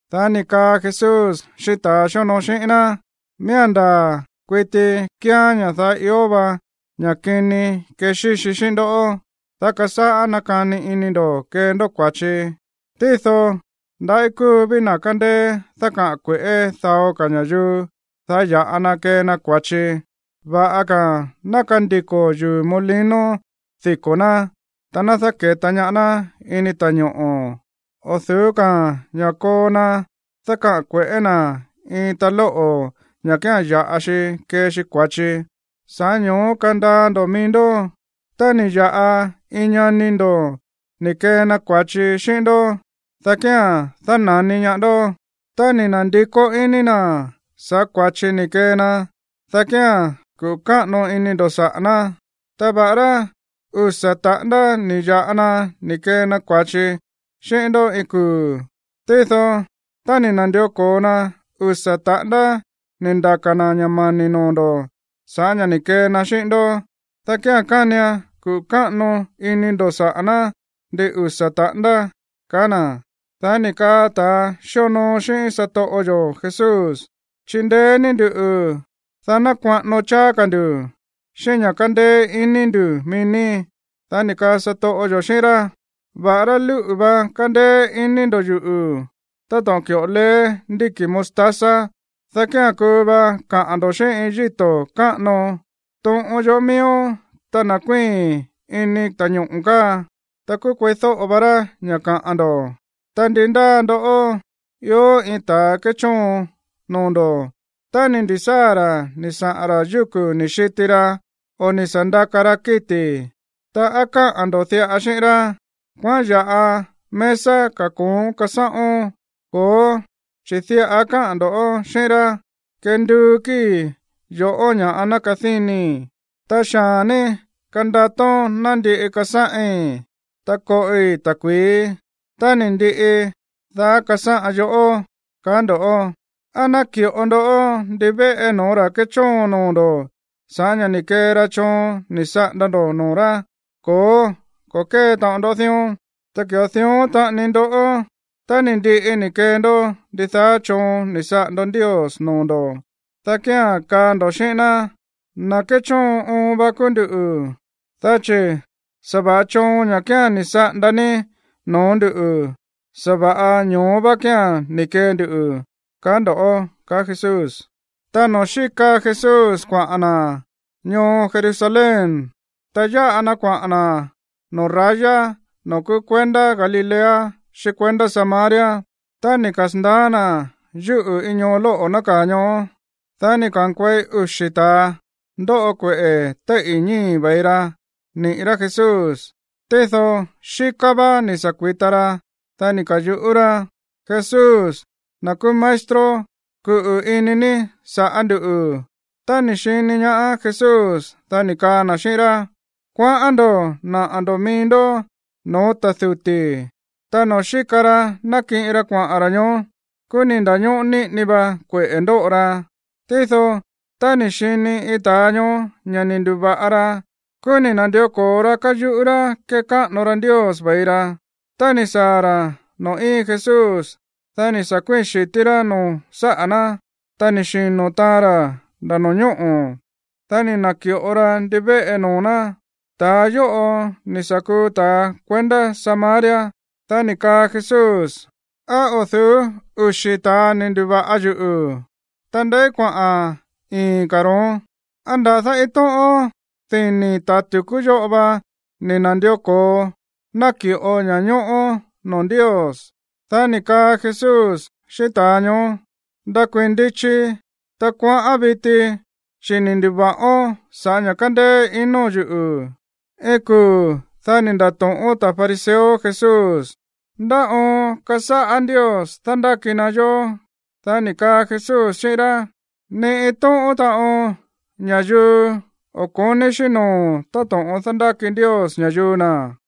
Dá ni̱ kaa Jesús xíꞌín ta̱a xíonoo xíꞌín ná: ―Miía̱n ndaa̱ kuiti kíán ña̱ daá ió va ña̱ꞌa kini kexíxi xíꞌín ndó, dá kasáꞌá nakani ini ndo̱ kee ndó kua̱chi. Tído ndaꞌí kúu ví na̱ kándéé dákaꞌa̱n kue̱ꞌé dao ka̱ ña̱yuu, dá ya̱ꞌa na kee na kua̱chi. Va̱ꞌa ka̱ ná kandiko̱ yuu̱ molino diko̱ ná, ta ná dáke̱ta ñaá ná ini ta̱ñoꞌo̱, o̱ du̱ú ka̱ ña̱ koo na dákaꞌa̱n kue̱ꞌé na̱ iin talóꞌo̱ ña̱ kía̱n ya̱ꞌa xi kee xi kua̱chi. Sa̱ꞌá ño̱ó kandaa ndo̱ mií ndó. ’Tá ni̱ ya̱ꞌa iin ñani ndo̱ ni̱ kee na kua̱chi xíꞌín ndó, dá kía̱n dána̱ni ñaá ndó. Tá ni̱ na̱ndikó iní na̱ sa̱ꞌá kua̱chi ni̱ kee na, dá kía̱n kuꞌu̱ káꞌano ini ndo̱ saꞌa̱ ná. Ta va̱ꞌará usa̱ taꞌándá ni̱ ya̱ꞌa na ni̱ kee na kua̱chi xíꞌín ndó iin kuu̱, tído tá ni̱ na̱ndió ko̱o na usa̱ taꞌándá ni̱ ndaka̱ na̱ ña̱ mani̱ noo̱ ndo̱ sa̱ꞌá ña̱ ni̱ kee na xíꞌín ndó, dá kía̱n kánian kuꞌu̱ káꞌano ini ndo̱ saꞌa̱ ná ndin usa̱ taꞌándá ―kaá na̱. Dá ni̱ kaa ta̱a xíonoo xíꞌín satoꞌo yo̱ Jesús: ―Chindeé ní nduꞌu̱, dá ná kuaꞌano cháá ka̱ ndu̱ xíꞌín ña̱ kándéé iní ndu̱ mií ní. Dá ni̱ kaa satoꞌo yo̱ xíꞌín rá: ―Va̱ꞌará lúꞌu̱ va kándéé ini ndo̱ yuꞌu̱ táto̱ꞌon ki̱ꞌo leé ndíki̱ mostaza, dá kía̱n kuu va kaꞌa̱n ndo̱ xíꞌín iin yíto̱ káꞌano: “Toꞌon yoꞌó miíón, ta ná kuíi̱n ini ta̱ñoꞌo̱ káa.” Ta kúú kueídóꞌo va rá ña̱ kaꞌa̱n ndo̱. ’Ta ndi ndáa ndoꞌó ió iin ta̱ kéchóon noo̱ ndo̱, tá ni̱ ndi̱sáa̱ ra̱ ni̱ saꞌa̱n ra̱ yúku̱ ni̱ xiti ra o ni̱ sa̱ ndaka ra kíti̱, ta, ¿á káꞌa̱n ndo̱ diꞌa xíꞌín rá: “Kuaꞌán ya̱ꞌa mesa kako̱ón kasáꞌón”? Ko̱ó, chi̱ diꞌa káꞌa̱n ndo̱ xíꞌín rá: “Kenduu kíi̱ yo̱ꞌó ña̱ꞌa ná kadínii, ta xaa̱n ní kandatón ná ndiꞌi kasáꞌin, ta koꞌi ta̱kui̱í. Tá ni̱ ndiꞌi, dá kasáꞌan yoꞌó”, kaá ndo̱. ¿Á náki̱ꞌo ndó ndivéꞌe no̱ó ra̱ kéchóon noo̱ ndo̱ sa̱ꞌá ña̱ ni̱ kee ra choon ni̱ saꞌanda ndo̱ noo̱ rá? Ko̱ó, ko̱ kée taꞌon ndó dión. Ta ki̱ꞌo dión taꞌani ndoꞌó, tá ni̱ ndiꞌi ni̱ kee ndó ndidaá choon ni̱ saꞌanda Ndios noo̱ ndo̱, dá kía̱n kaa ndo̱ xíꞌín ná: “Na̱ kéchóon oon va kúú nduꞌu̱, dá chi̱ sa̱va̱ꞌa choon, ña̱ kía̱n ni̱ saꞌanda ní no̱ó nduꞌu̱, sa̱va̱ꞌa ño̱ó vá kía̱n ni̱ kee ndu”, kaa ndo̱ ―kaá Jesús. Tá noo̱ xíka Jesús kuaꞌa̱n na̱ ñoo Jerusalén, ta yáꞌa na kuaꞌa̱n na̱ noo̱ raya noo̱ kúú kuendá Galilea xíꞌín kuendá Samaria. Tá ni̱ kasa̱ndaá na̱ yúꞌu̱ iin ñoo lóꞌo̱ nákaa̱ ñoó, dá ni̱ ka̱nkuei uxi̱ ta̱a ndóꞌo kueꞌe̱ téíꞌi̱ ñíi̱ ve̱i ra niꞌi̱ rá Jesús, tído xíká vá ni̱ sa̱ kui̱ta ra. Dá ni̱ ka̱yuꞌú rá: ―¡Jesús, na̱ kúú maestro, kuꞌu̱ ini ní sa̱ꞌá nduꞌu̱! Tá ni̱ xini ñaá Jesús, dá ni̱ kaa na̱ xíꞌín rá: ―Kuaꞌán ndo̱ naꞌa̱ ndo̱ mií ndó no̱ó ta̱ duti̱. Ta noo̱ xíka ra nákiꞌin ra kuaꞌa̱n ra̱ ñoó, kúú ni̱ nda̱ñóꞌó níꞌini va kueꞌe̱ ndóꞌo ra. Tído tá ni̱ xini iin ta̱a ñoó ña̱ ni̱ ndu̱va̱ꞌa ra, kúú ni̱ na̱ndió ko̱o ra káyuꞌú rá kékáꞌano ra Ndios ve̱i ra. Tá ni̱ saa̱ ra̱ noo̱ íin Jesús, dá ni̱ sa̱ kuíi̱n xi̱tí rá no̱ó saꞌa̱ ná, ta ni̱ xino̱ taan ra̱ nda̱ no̱ñóꞌo̱. Dá ni̱ na̱ki̱ꞌo ra ndivéꞌe noo̱ ná. Ta̱a yóꞌo ni̱ sa̱ kuu ta̱ kuendá Samaria. Dá ni̱ kaa Jesús: ―¿Á o̱ du̱ú uxi̱ ta̱a ni̱ ndu̱va̱ꞌa yuꞌu̱? Ta, ¿ndeí kuaꞌa̱n ii̱n ka̱ ro̱ón? ¿Á nda̱dá iin tóꞌón dini̱ ta̱ tu̱kú yóꞌo va ni̱ na̱ndió ko̱o naki̱ꞌo ña̱ñóꞌó noo̱ Ndios? Dá ni̱ kaa Jesús xíꞌín ta̱a ñoó: ―Ndakuii̱n ndichi, ta kuaꞌán viti, chi̱ ni̱ ndu̱va̱ꞌón sa̱ꞌá ña̱ kándéé ino̱n yuꞌu̱. Iin kuu̱, dá ni̱ nda̱to̱ꞌón ta̱ fariseo Jesús: ―¿Ndá oon kasáꞌá Ndios dándáki na yó? Dá ni̱ kaa Jesús xíꞌín rá: ―Ni iin tóꞌón taꞌon ña̱yuu o̱ ko̱ní xíꞌín noo̱ táto̱ꞌon dándáki Ndios ña̱yuu na̱.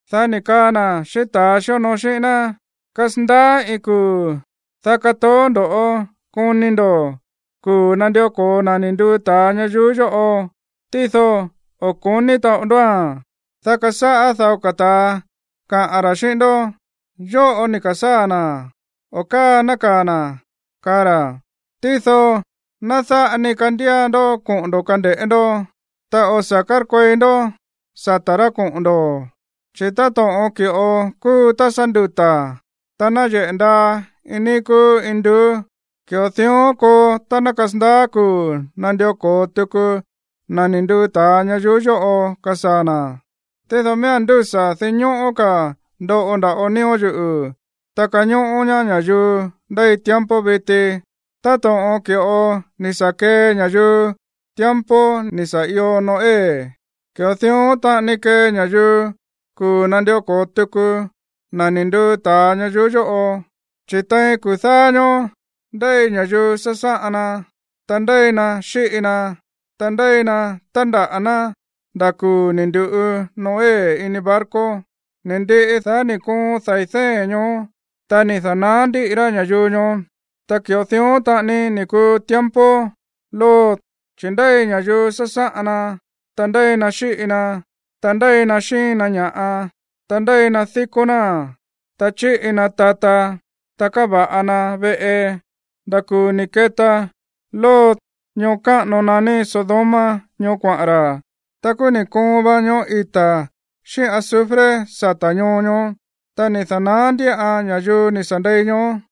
Dá ni̱ kaa na̱ xíꞌín ta̱a xíonoo xíꞌín ná: ―Kasandaá iin kuu̱, dá katoó ndo̱ koni ndo̱ kuu̱ nandió ko̱o na̱ ni̱ nduu ta̱a ñayuú yóꞌo, tído o̱ ko̱ní taꞌon ndóa̱n. Dá kasáꞌá dao ta̱a kaꞌa̱n ra̱ xíꞌín ndó: “Yóꞌo ni̱ ka̱sáa̱ na̱”, o “Káa nákaa̱ na̱”, kaa ra̱. Tído ná dáꞌa ni kandía ndó koꞌo̱n ndo̱ kande̱ꞌé ndó, ta o̱ sa̱ kárkuei ndó sata̱ rá koꞌo̱n ndo̱. Chi̱ táto̱ꞌon ki̱ꞌo kúu tá sá nduta̱, ta náyeꞌe̱ ndaa iin níí kúú induú, ki̱ꞌo dión koo tá ná kasandaá kuu̱ nandió ko̱o tuku na̱ ni̱ nduu ta̱a ñayuú yóꞌo kasaa̱ na̱. Tído miía̱n ndúsa̱ dinñóꞌó ka̱ ndoꞌo nda̱ꞌo nío̱ yuꞌu̱, ta kañóꞌó ñaá ña̱yuu ndéi tiempo viti. ’Táto̱ꞌon ki̱ꞌo ni̱ sa̱ kee ña̱yuu tiempo ni̱ sa̱ io Noé, ki̱ꞌo dión taꞌani kee ña̱yuu kuu̱ nandió ko̱o tuku na̱ ni̱ nduu ta̱a ñayuú yóꞌo. Chi̱ tein kuu̱ dáá ñóó ndéi ña̱yuu sásáꞌan na, ta ndéi na xíꞌi na, ta ndéi na tándaꞌa̱ ná nda̱ kuu̱ ni̱ ndu̱ꞌu Noé ini barco. Ni̱ ndiꞌi, dá ni̱ koon dai̱ dée̱n ñoó, ta ni̱ da̱naá ndiꞌi rá ña̱yuu ñoó. Ta ki̱ꞌo dión taꞌani ni̱ kuu tiempo Lot, chi̱ ndéi ña̱yuu sásáꞌan na, ta ndéi na xíꞌi na, ta ndéi na xíin na ña̱ꞌa, ta ndéi na díkó náa̱n, ta chíꞌi na tata, ta káva̱ꞌa na veꞌe, nda̱ kuu̱ ni̱ keta Lot ñoo káꞌano naní Sodoma ñoó kuaꞌa̱n ra̱. Ta kúú ni̱ koon va ñoꞌó ita̱ xíꞌín azufre sata̱ ñoo ñoó, ta ni̱ da̱naá ndíꞌan ña̱yuu ni̱ sa̱ ndei ñoó.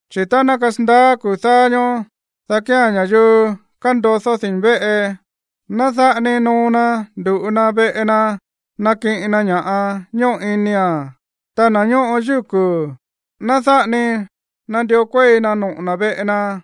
’Chi̱ tá ná kasandaá kuu̱ dáá ñóó, dá kía̱n ña̱yuu kándodó dini̱ véꞌe, ná dáꞌa ni noo na ndu̱ꞌu na̱ veꞌe na nakiꞌin na ña̱ꞌa ñóꞌo inia̱n. Ta na̱ ñóꞌo yúku̱, ná dáꞌa ni nandió kuéi na noꞌo̱ na̱ veꞌe na.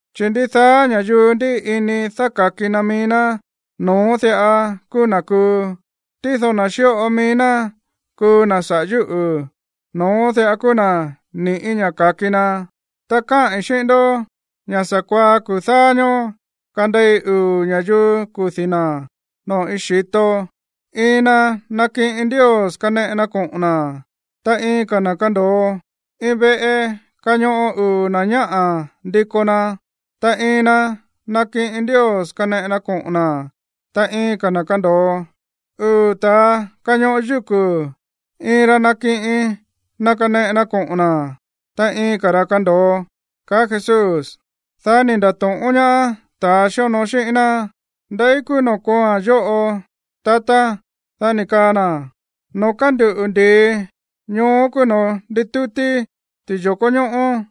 Chi̱ ndidaá ña̱yuu ndíꞌi ini dáka̱ki na mií ná, no̱ón diꞌa kúú na̱ kuu. Tído na̱ xíꞌo mií ná kuu na̱ saꞌa̱ yúꞌu̱, no̱ón diꞌa kúú na̱ ni̱ꞌí ña̱ ka̱ki na. Ta káꞌi̱n xíꞌín ndó ña̱ sa̱kuaá kuu̱ dáá ñóó kandei uu̱ ña̱yuu kudi̱ na̱ noo̱ iin xi̱to. Iin na nakiꞌin Ndios kaneꞌe na koꞌo̱n na̱, ta iin ka̱ na̱ kando̱o. Iin veꞌe kañoꞌo uu̱ na̱ ñáꞌa̱ ndiko na. Ta iin na nakiꞌin Ndios kaneꞌe na koꞌo̱n na̱, ta iin ka̱ na̱ kando̱o. Uu̱ ta̱a kañoꞌo yúku̱. Iin ra nakiꞌin na kaneꞌe na koꞌo̱n na̱, ta iin ka̱ ra̱ kando̱o ―kaá Jesús. Dá ni̱ nda̱to̱ꞌón ñaá ta̱a xíonoo xíꞌín ná: ―¿Ndeí kúú noo̱ kooa̱n yóꞌo, tatá? Dá ni̱ kaa na̱: ―Noo̱ kánduꞌu̱ ndi̱i, ñoó kúú noo̱ nditútí ti̱yo̱kó ñóꞌó.